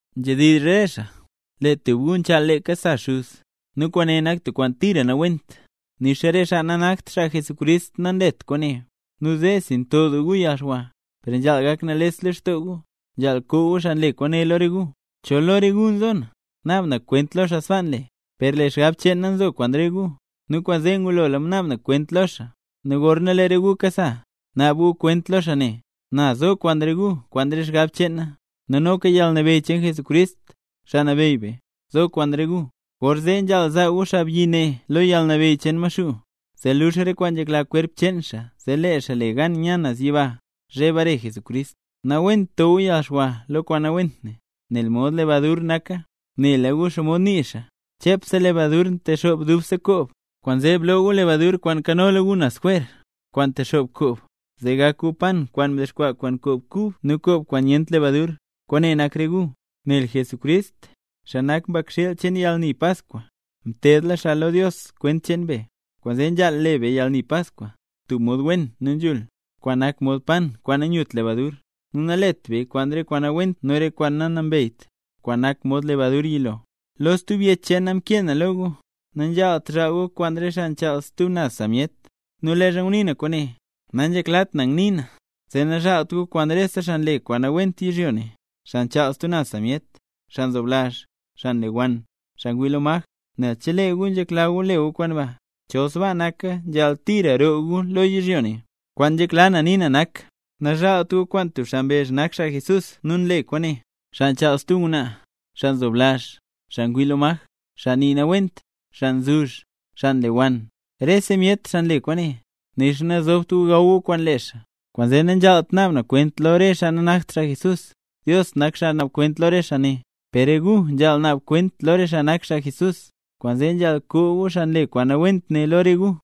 Nzhedizh re xaa, lee tub gu nchaal leeka sa xuz. ¡Nu kwaane nak tub kwaan tira nawent, nixa re xaa nanakt xaa Jesucrist nanlet kwaane! Nu zeesi nto doo gu yalxwa, per nzhaal gak nales lextoo gu. Nzhaal koo gu xaa nle kwaane lo re gu. Chol lo re gu nzo na, naab na kwent lo xaa sbaa nle. Per lee xgab cheen na nzo kwaan gu, nu kwaanzee ngulola mnaab na kwent lo xaa. Nu gorna lee re gu kasa, naab gu kwent lo xaa ne, na zo kwaan re gu kwaan re xgab cheen na, nu noka yalnabeyy cheen Jesucrist, Xaa Nabeyy be, zo kwaan re gu. Gorzee nzhaal zaa gu xaabyi ne lo yalnabeyy cheen Maxuu, zee luux re kwaan nzhekla kwerp cheen xaa, zee lee xaa le gan nya naz yiba, zhe bare Jesucrist. Nawent to gu yalxwa lo kwaan nawent ne, nel mod lebadur naka. Nela gu xomod nii xaa: “Chepse lebadur ntexoob dubse koob”. Kwaanzee bloo gu lebadur kwaan nkanola gu naz jwer, kwaan ntexoob koob, zee gak gu pan kwaan mdexkwaa kwaan koob kub nu koob kwaan nyent lebadur, kwaane nak re gu. Nel Jesucrist, xaa nak mbakxiil cheen yalni Paskwa, mteedla xaa lo Dios kwent cheen be. Kwaanzee nzhaal le be yalni Paskwa, tub mod wen nu nzhul, kwaan nak mod pan kwaan nanyut lebadur, nu nalet beya kwaan re kwaan nawent nu re kwaan nanambeyt, kwaan nak mod lebadur yilo. Lo stub yech cheen na mkee na lo gu, nanzhaalt zhaal gu kwaan re xaa kwaan nchaal stub naz sa myet. Nu leezha ngunii na kwaane, nanzheklat na ngnii na, zee nazhaalt gu kwaan rese xaa nle kwaan nawent yizhyo ne, xaa nchaal stub naz sa myet, xaa nzoblazh, xaa nlewann, xaa ngwii lo maj, nel chelee gu nzhekla gu le gu kwaan ba, chol sbaa naka nzhaal tira roo gu lo yizhyo ne. Kwaan nzhekla na nii na nak: Nazhaalt gu kwaan tub xaa mbezh nak xaa Jesús nu nle kwaane, xaa nchaal stub ngwnaa, xaa nzoblazh, xaa ngwii lo maj, xaa nii nawent, xaa nzuzh, xaa nlewann. Rese myet, xaa nle kwaane, nixa nazobt gu gaw gu kwaan lee xaa. Kwaanzee nanzhaalt naab na kwent lo re xaa nanakt xaa Jesús, Dios nak xaa naab kwent lo re xaa ne. Per re gu nzhaal naab kwent lo re xaa nak xaa Jesús, kwaanzee nzhaal koo gu xaa nle kwaan nawent ne lo re gu.